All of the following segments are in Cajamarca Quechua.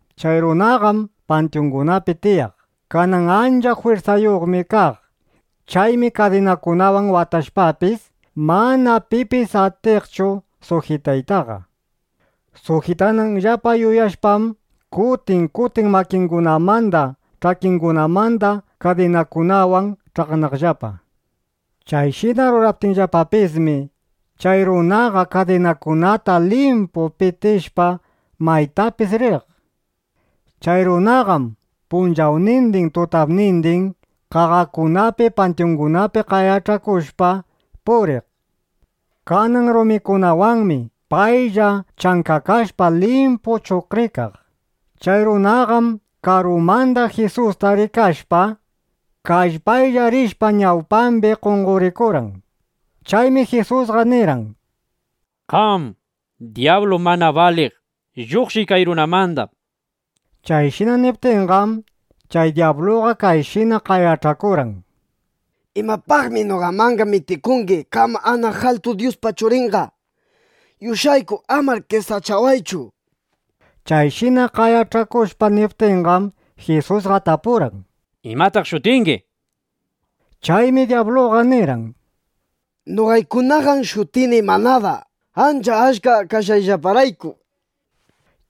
Chay runaqam pantyungunapi tiyaq. Kanan ancha jwirsayuqmi kaq. Chaymi kadinakunawan watashpapis, mana pipis atiqchu sujitaytaqa. Sujitananllapa yuyashpam, kutin kutin makingunamanda ch'akingunamanda kadinakunawan ch'aqnaqllapa. Chayshina ruraptinllapapismi, chay runaqa kadinakunata limpu pitishpa, maytapis riq. Chay runaqam punchawnindin, tutapnindin qaqakunapi, pantyungunapi qayach'akushpa puriq. Kanan rumikunawanmi paylla chankakashpa limpu chuqrikaq. Chay runaqam karumanda Jisusta rikashpa, kallpaylla rishpa, ñawpambi qonqorikurqan. Chaymi Jisusqa nirqan: —Qam, dyablu mana baliq, lluqshiy kay runamanda, nishpa. Chayshina niptinqam, chay dyabluqa kayshina qayach'akurqan: —¿Imapaqmi noqamanqa mitikungi qam anaq altu Dyuspa Churinqa? ¡Yush'ayku, amar qesachawaychu! nishpa. Chayshina qayach'akushpa niptinqam, Jisusqa tapurqan: —¿Imataq shutingi? nishpa. Chaymi dyabluqa nirqan: —Noqaykunaqam shutini Manada, ancha achka kashqayllaparayku, nishpa.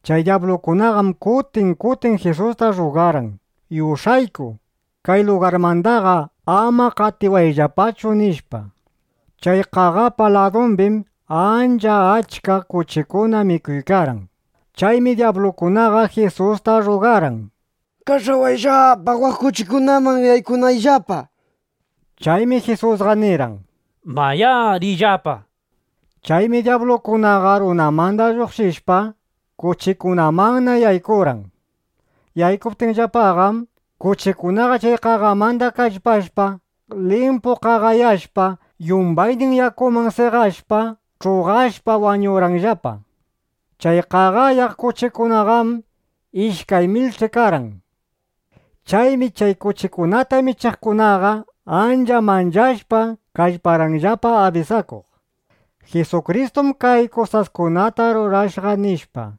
Chay dyablukunaqam kutin kutin Jisusta rrugarqan: —Yush'ayku, kay lugarmandaqa ama qatiwayllapachu, nishpa. Chay qaqapa ladumbim ancha achka kuchikuna mikuykarqan. Chaymi dyablukunaqa Jisusta rrugarqan: —Kach'awayllapa, waq kuchikunaman yaykunayllapa, nishpa. Chaymi Jisusqa nirqan: —Mayá, riyllapa, nishpa. Chaymi dyablukunaqa runamanda lluqshishpa, kuchikunamanna yaykurqan. Yaykuptinllapaqam, kuchikunaqa chay qaqamanda kallpashpa, limpu qaqayashpa, yumbaynin yakuman seqashpa, ch'uqashpa wañurqanllapa. Chay qaqayaq kuchikunaqam ishkay milch'i karqan. Chaymi chay kuchikunata michiqkunaqa ancha manchashpa kallparqanllapa abisakuq: —Jisukristum kay kusaskunata rurashqa, nishpa.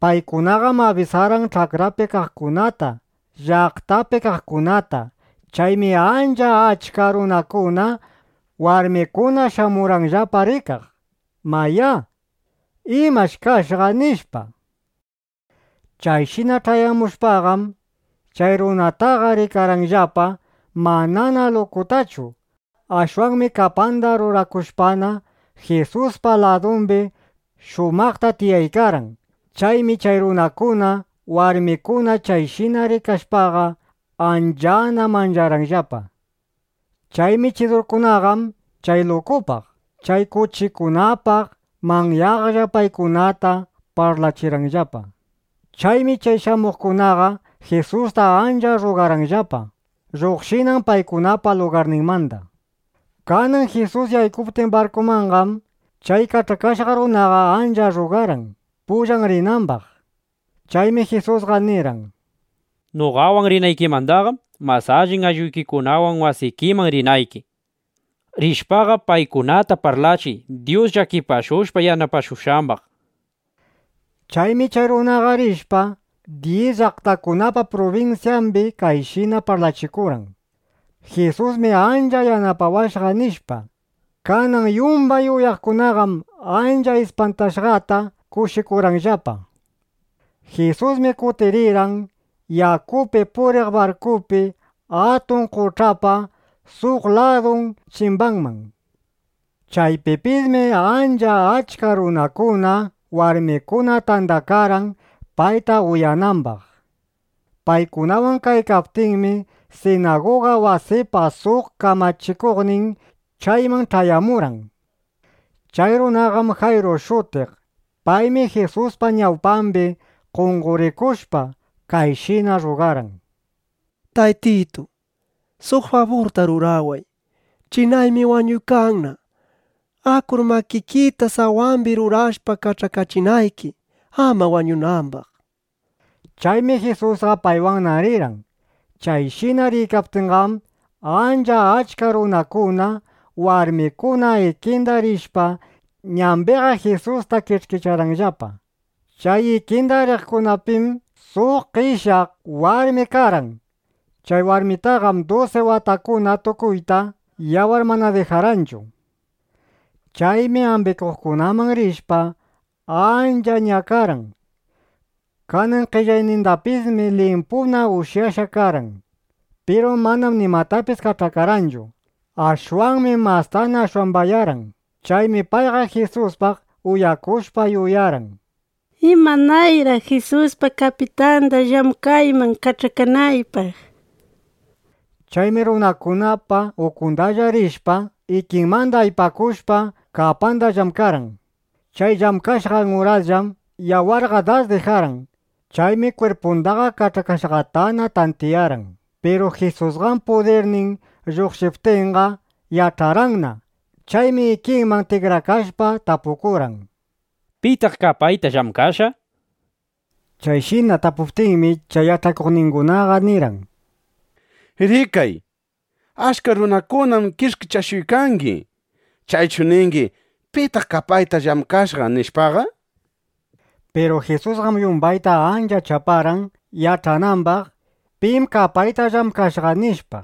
Paykunaqam abisarqan ch'akrapi kaqkunata, llaqtapi kaqkunata. Chaymi ancha achka runakuna, warmikuna shamurqanllapa rikaq, mayá, ¿imash kashqa? nishpa. Chayshina ch'ayamushpaqam, chay runataqa rikarqanllapa manana lukutachu. Ashwanmi kapanda rurakushpana, Jisuspa ladumbi shumaqta tiyaykarqan. Chaymi chay runakuna, warmikuna chayshina rikashpaqa, anchana mancharqanllapa. Chay michidurkunaqam chay lukupaq, chay kuchikunapaq manyaqlla paykunata parlachirqanllapa. Chaymi chay shamuqkunaqa Jisusta ancha rrugarqanllapa, lluqshinan paykunapa lugarninmanda. Kanan Jisus yaykuptin barkumanqam, chay kach'akashqa runaqa ancha rrugarqan, pullan rinambaq. Chaymi Jisusqa nirqan: —Noqawan rinaykimandaqam mas allin aylluykikunawan wasikiman rinayki. Rishpaqa, paykunata parlachiy Dyus llakipashushpa yanapashushqambaq. Chaymi chay runaqa rishpa, dyis llaqtakunapa prubinsyambi kayshina parlachikurqan: “Jisusmi ancha yanapawashqa” nishpa. Kanan yumbay uyaqkunaqam ancha ispantashqata kushikurqanllapa. Jisusmi kutirirqan yakupi puriq barkupi atun qoch'apa suq ladun chimbanman. Chaypipismi ancha achka runakuna, warmikuna tandakarqan, payta uyanambaq. Paykunawan kaykaptinmi, sinaguga wasipa suq kamachikuqnin chayman ch'ayamurqan. Chay runaqam Jayru shutiq. Paymi Jisuspa ñawpambi qonqorikushpa, kayshina rrugarqan: —Taytitu, suq faburta ruraway. Chinaymi wañuykanna. Akur makikita sawambi rurashpa, kach'akachinayki, ama wañunambaq, nishpa. Chaymi Jisusqa paywanna rirqan. Chayshina riykaptinqam, ancha achka runakuna, warmikuna ikinda rishpa, ñambiqa Jisusta kish'kicharqanllapa. Chay ikinda riqkunapim suq qeshyaq warmi karqan. Chay warmitaqam dusi watakuna tukuyta yawar mana dijarqanchu. Chaymi ambikuqkunaman rishpa ancha ñakarqan. Kanan qellaynindapismi limpuna ushyashqa karqan. Piru manam nimatapis kach'akarqanchu. Ashwanmi mastana ashwambayarqan. Chaymi payqa Jisuspaq uyakushpa, yuyarqan: ¿Imanayraq Jisuspa kapitanda llamkayman kach'akanaypaq? nishpa. Chaymi runakunapa ukundalla rishpa, ikimanda aypakushpa, kapanda llamkarqan. Chay llamkashqan urasllam yawarqa das dijarqan. Chaymi kwirpundaqa kach'akashqatana tantiyarqan. Piru Jisusqam pudirnin lluqshiptinqa, yach'arqanna. Chaymi ikiman tikrakashpa tapukurqan: —¿Pitaq kapayta llamkashqa? nishpa. Chayshina tapukuptinmi, chay yach'akuqningunaqa nirqan: —Rikay, achka runakunam kish'kichashuykangi. ¿Chaychu ningi: “¿Pitaq kapayta llamkashqa?” nishpaqa? Piru Jisusqam yumbayta ancha chaparqan, yach'anambaq, ¿Pim kapayta llamkashqa? nishpa.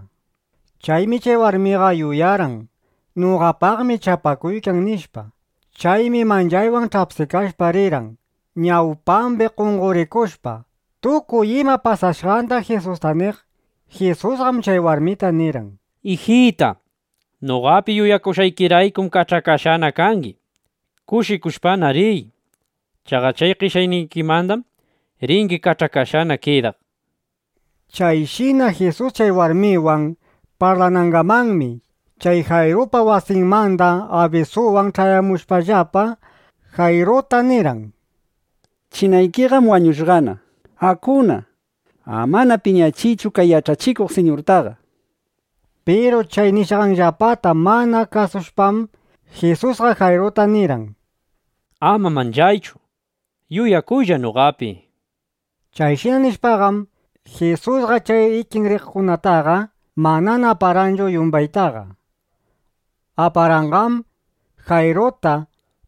Chaymi chay warmiqa yuyarqan: Noqapaqmi chapakuykan, nishpa. Chaymi manchaywan ch'apsikashpa rirqan, ñawpambi qonqorikushpa, tukuy ima pasashqanda Jisusta niq. Jisusqam chay warmita nirqan: —Ijita, noqapi yuyakushqaykiraykum kach'akashqana kangi. Kushikushpana riy. Chaqa chay qeshyaynikimandam ringi kach'akashqana kidaq, nishpa. Chayshina Jisus chay warmiwan parlanangamanmi, chay Jayrupa wasinmanda abisuwan ch'ayamushpallapa, Jayruta nirqan: —Chinaykiqam wañushqana. Akuna. Amana piñachiychu kay yach'achikuq siñurtaqa, nishpa. Piru chay nishqanllapata mana kasushpam, Jisusqa Jayruta nirqan: —Ama manchaychu. Yuyakuylla noqapi, nishpa. Chayshina nishpaqam, Jisusqa chay ikin riqkunataqa manana aparqanchu yumbaytaqa. Aparqanqam Jayruta,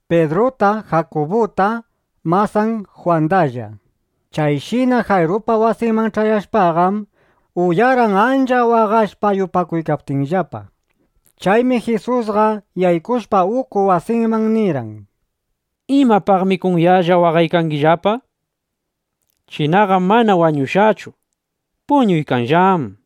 Pidruta, Jakubuta, masan Jwandalla. Chayshina Jayrupa wasinman ch'ayashpaqam, uyarqan ancha waqashpa yupakuykaptinllapa. Chaymi Jisusqa yaykushpa uku wasinman nirqan: —¿Imapaqmi kunyallaqa waqaykangillapa? Chinaqam mana wañushqachu. Puñuykanllám, nishpa.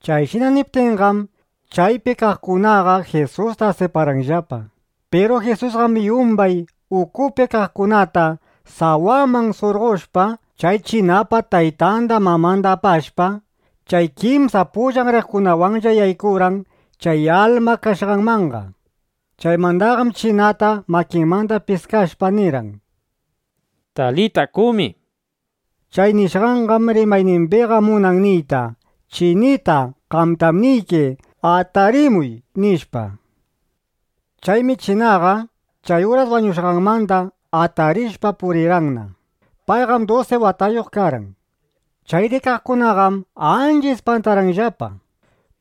Chayshina niptinqam, chaypi kaqkunaqa Jisusta asiparqanllapa. Piru Jisusqam yumbay ukupi kaqkunata sawaman surqoshpa, chay chinapa taytanda, mamanda apashpa, chay kimsa pullan riqkunawanlla yaykurqan chay alma kashqanmanqa. Chaymandaqam chinata makinmanda piskashpa nirqan: —Talita kumi. Chay nishqanqam rimaynimbiqa munan niyta: “Chinita, qamtam niyki, ¡atarimuy!” nishpa. Chaymi chinaqa chay uras wañushqanmanda atarishpa purirqanna. Payqam dusi watayuq karqan. Chay rikaqkunaqam ancha ispantarqanllapa.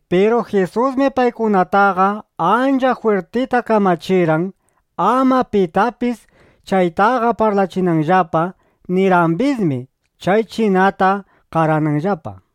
Piru Jisusmi paykunataqa ancha jwirtita kamachirqan, ama pitapis chaytaqa parlachinanllapa. Nirqambismi chay chinata qarananllapa.